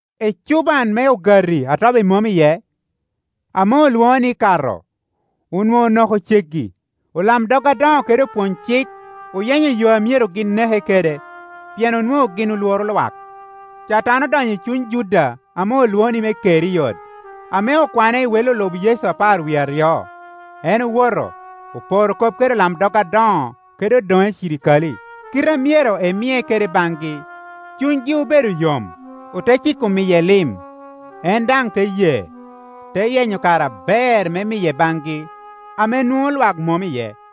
Ecuban me Ogati a Tobi Mom iye, ame olwoŋo ni Kato, onwoŋo onoko ceggi. Olamdog adoŋo kede opwony-cik oyenyo yo a myero gin neke kede, pien onwoŋo gin olworo lwak. Catan odonyo i cuny Juda ame olwoŋo me Keriot, ame okwane i wei olub Yecu apar wie aryo. En owoto, oporo kop kede olamdog adoŋo kede odoŋe cirikale, kite a myero emie kede baŋgi. Cunygi obedo yom, ote ciko miye lim. En daŋ te ye, te yenyo kare aber me miye baŋgi ame nwoŋo lwak mom iye.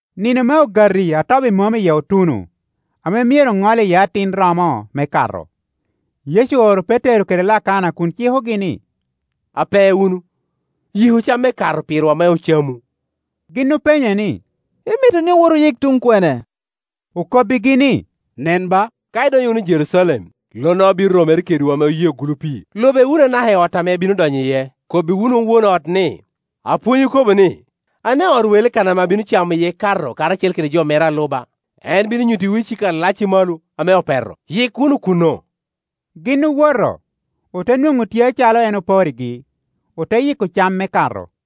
Nino me Ogati a Tobi Mom iye otuno, ame myero oŋol iye atin romo me Kato. Yecu ooro Petero kede Lakana kun cikogi ni, “Ape wunu, yiku cam me Kato pirwa me ocamu.” Gin openye ni, “Imito ni owot oyik tuŋ kwene?” Okobbigi ni, “Nen ba, ka idonyo wunu i Jerucalem, lonnoro bino romere kedwu ame oyeo gulu pii. Lube wunu anaka i ot ame ebino donyo iye. Kobbi wunu won ot ni, ‘Apwony okobo ni, Ane ot welo kan ame abino camo iye Kato karacel kede jo mera a luba?’ En bino nyuttiwu icika alac i malo ame opeto; yik wunu kuno.” Gin owoto, ote nwoŋo tye acalo en oporrigi, ote yiko cam me Kato.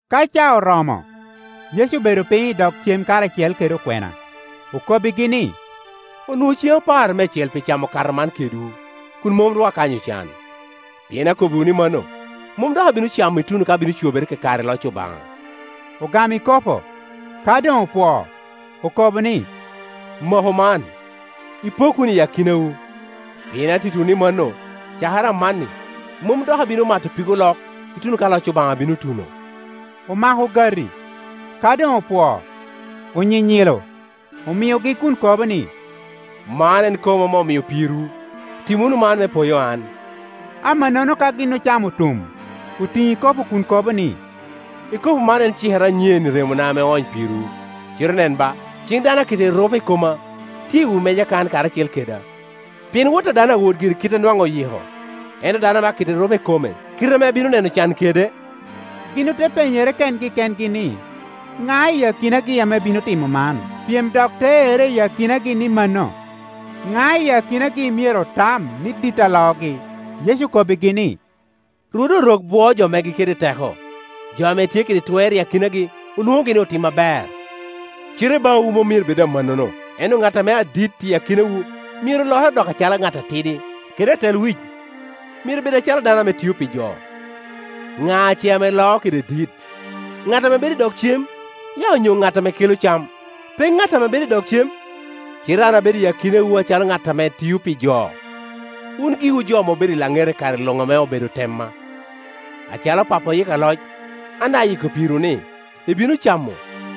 Ka caa oromo, Yecu obedo piny i dog cem karacel kede okwena. Okobbigi ni, “Onwoŋo ceŋ aparo meicel pi camo Kato man kedwu, kum mom ru akanyo can; pien akobbiwu ni mano, mom dok abino camo, ituno ka bino cobere kakare i loc Obaŋa.” Ogamo ikopo; ka doŋ opwoo, okobo ni, “Maku man, ipok wunu i akinawu; pien attitiwu ni mano, cakere amanni, mom dok abino mato pig olok, ituno ka loc Obaŋa bino tuno.” Omako ogati; ka doŋ opwoo, onyinyilo, omiogi kun kobo ni, “Man en koma ame omio pirwu. Tim wunu man me poyo an,” Amannono ka gin ocamo otum, otiŋo ikopo kun kobo ni, “Ikopo man en cikere anyen i remona ame oony pirwu. Cite nen ba, ciŋ dano a keto erupe i koma tye i wi meja kan karacel keda. Pien Wot a dano awot gire i kite a nwaŋ oyiko; ento dano a keto erupe i kome, kite ame ebino neno can kede!” Gin ote penyere kengi kengi ni, ŋa i akinagi ame bino timo man. Pyem dok te erre i akinagi ni mano, ŋa i akinagi myero otam ni dit a loogi? Yecu okobbigi ni, “Rwode Orok bwoo jo megi kede teko; jo ame tye kede twer i akinagi olwoŋogi ni otim aber. Cite i baŋwu mom myero bed amannono; ento ŋat ame adit i akinawu myero lokere dok acalo ŋat atidi, kede atelwic myero bed acalo dano ame tio pi jo. Ŋa ce ame loo kede dit, ŋat ame bedo i dog cem, ya onyo ŋat ame kelo cam? Pe ŋat ame bedo i dog cem? Cite an abedo i akinawu acalo ŋat ame tio pi jo. “Wun giwu jo ame obedo i laŋeta i kare luŋ ame obedo tema. Acalo Pappa oyikka loc, an daŋ ayiko pirwu ni, ibino camo,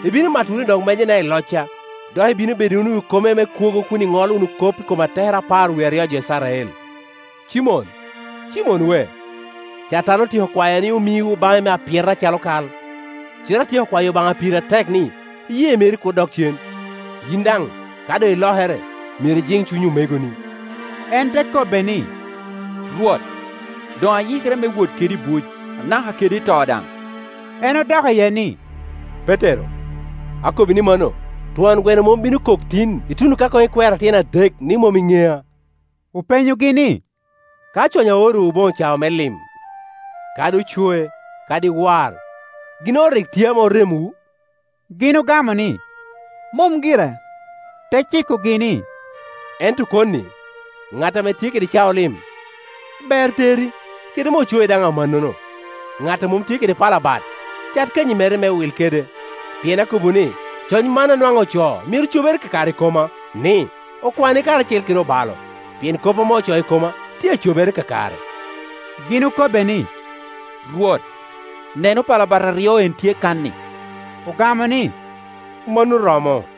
ibino mato wunu i dog mejana i locca, dok ibino bedo wunu i wi kome me kwogo kun iŋolo wunu kop i kom atekere apar wie aryo a jo Icrael. “Cimon, Cimon we, Catan otyeko kwayo ni omiwu baŋe me apyeta acalo kal, cite atyeko kwayo Obaŋa piri atek ni, iyee meri kur dok cen. Yin daŋ, ka doŋ ilokere, myero ijiŋ cuny omegoni.” En te kobbe ni, “Rwot, doŋ ayikere me wot kedi i buc, anaka kede i to daŋ.” En odok iye ni, “Petero, akobbi ni mano, twon gweno mom bino koko tin, ituno ka koŋ ikwera tyen adek, ni mom iŋea.” Openyogi ni, “Ka cwany aorowu boŋo cao me lim, kadi ocoe, kadi war, ginnoro rik tye ame oremowu?” Gin ogamo ni “Mom gire.” Te cikogi ni, “Ento koni, ŋat ame tye kede cao lim, ber teri; kede me ocoe daŋ amannono. Ŋat a mom tye kede pala bat cat kanyi mere me wil kede. Pien akobbiwu ni, coc man a nwaŋ ocoo myero cobere kakare i koma, ni, ‘Okwane karacel kede obalo’; pien kop ame ocoo i koma tye a cobere kakare.” Gin okobbe ni, “Rwot, neno, pala bat aryo en, tye kan-ni.” Ogamo ni, “Mano romo.”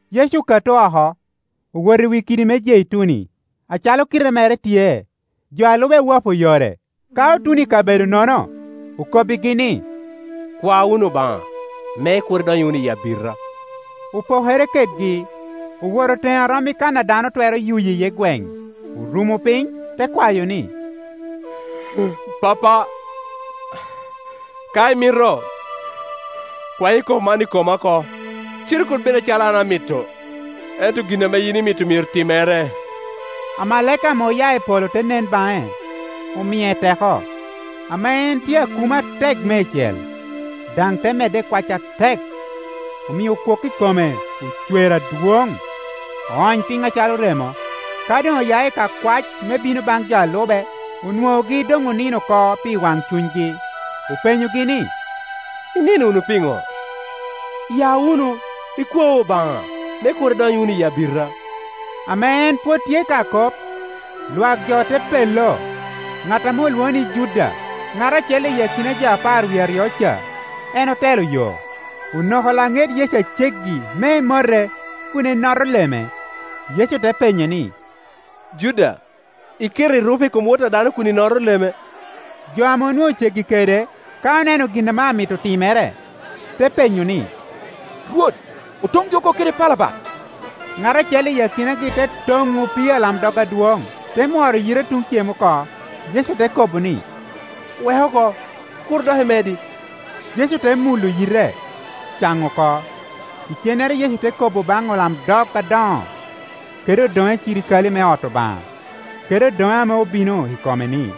Yecu okato oko, owoto i wi kidi me Jeituni, acalo kite mere tye; jo a lube owapo yore. Ka otuno i kabedono-no, okobbigi ni, “Kwa wunu Obaŋa, me kur idony wunu i abita.” Opokere kedgi, owoto teŋe a rom i kan a dano twero yuyo iye gweŋ, orumo piny, te kwayo ni, “Pappa, ka imito, kwany ikopo man i koma oko; cite kur bed acalo an amito, ento gin ame yin imito myero timere.” [ Amalaika ame oya i polo te nen baŋe, omie teko. Ame en tye akumo atek meicel, daŋ te medde i kwac atek; omio kwok i kome ocwer adwoŋ, oony piny acalo remo.] Ka doŋ oya i ka kwac me bino baŋ jo a lube, onwoŋogi doŋ onino oko pi wancunygi. Openyogi ni, “Inino wunu pino? Ya wunu, ikwau Obaŋa, me kur idony wunu i abita.” Ame en pwod tye ka kop, lwak jo te pello; ŋat ame olwoŋo ni Juda, ŋat acel i akina jo apar wie aryo ca, en otelo yo. Onoko laŋet Yecu aceggi me emote kun enoto Ieme. Yecu te penye ni, “Juda, iketo erupe i kom Wot a dano kun inoto leme?” Jo ame onwoŋo ceggi kede, ka oneno gin ame amito timere, te penyo ni, “Rwot, otongi oko kede pala bat?” Ŋat acel i akinagi te toŋo opii alamdog adwoŋ, te mworo yite tun cem oko. Yecu te kobo ni, “Wek oko. Kur dok imedi!” Yecu te mulo yite, caŋo oko. Icennere Yecu te kobo baŋ olamdog adoŋo, kede odoŋe cirikale me ot Obaŋa, kede odoŋe ame obino i kome ni,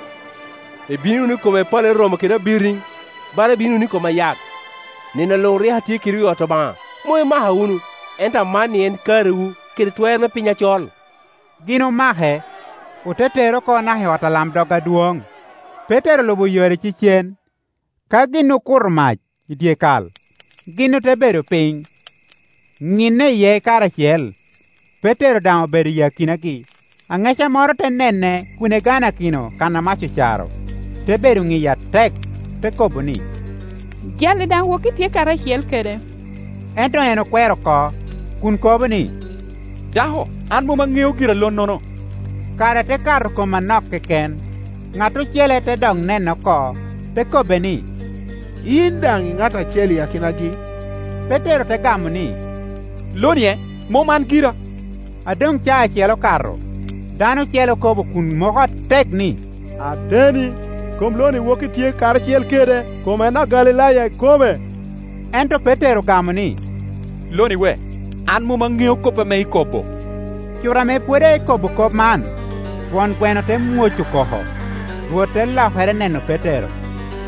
“Ibino wunu i koma i pale romo kede abiriŋ, bala ibino wunu i kom ayak? Nino luŋ rik atye kedwu i ot Obaŋa, mom imaka wunu. Ento amanni en karewu, kede twer me piny acol.” Gin omake, ote tere oko naka i ot alamdog adwoŋ. Petero olubo yore icecen. Ka gin okuto mac i dyekal, gin te bedo piny, ŋinne iye karacel; Petero daŋ obedo i akinagi. Aŋeca moro te nene kun eganakino kan a mac ocaro; te bedo niye atek, te kobo ni, “Jal-li daŋ woki tye karacel kede.” Ento en okwero oko, kun kobo ni, “Dako, an mom aŋeo gira lonnono.” Kare te kato kom anok keken, ŋat ocele te dok nene oko, te kobbe ni, “Yin daŋ i ŋat acel i akinagi.” Petero te gamo ni, “Lo-nie, mom an gira.” A doŋ caa acel okato, dano ocele okobo kun moko atek ni, “Ateni, kom lo-ni woki tye karacel kede; kom en Agalilaya ikome.” Ento Petero ogamo ni, “Loni we, an mom aŋeo kop ame ikobo.” Cuto ame pwod ekobo kop man, twon gweno te mwoco koko. Rwot te lokere neno Petero,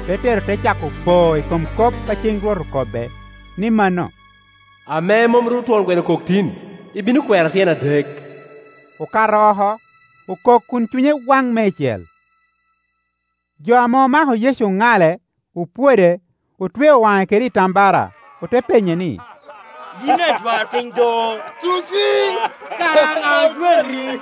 Petero te cako po i kom kop a ceŋ Rwot okobbe, ni mano, “Ame mom ru twon gweno okok tin, ibino kwera tyen adek.” Okato oko, okok kun cunye waŋ meicel. Jo ame omako Yecu oŋale, opwode. Otweo waŋe kede itambara, ote penye ni, “Yin adwarpiny do, tuci! Kara ŋa ojwati?”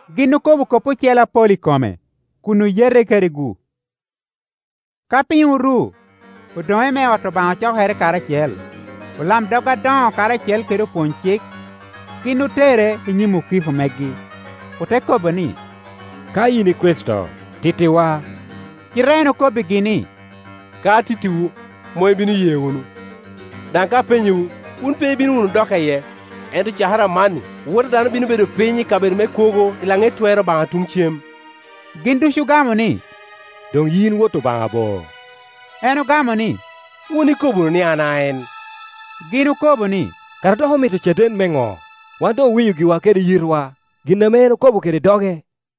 Gin okobo kop ocele apol i kome, kun oyete kede-gu. Ka piny oru, odoŋe me ot Obaŋa ocokere karacel, olamdog adoŋo karacel kede opwony-cik. Gin otere i nyim okiko megi, ote kobo ni, “Ka yin i Kricito, tittiwa.” Cite en okobbigi ni, “Ka atittiwu, mom ibino ye wunu; daŋ ka apenyowu, wun pe ibino wunu dokka iye. Ento cakere amanni, Wot a dano bino bedo piny i kabedo me kwogo i laŋet Twer Obaŋa tuŋ cem.” Gin ducu ogamo ni, “Doŋ yin Wot Obaŋa bo?” En ogamo ni, “Wun ikobo wunu ni an a en.” Gin okobo ni, “Kara dok omito caden me ŋo? Wan doŋ owinyo giwa kede yitwa gin ame en okobo kede doge.”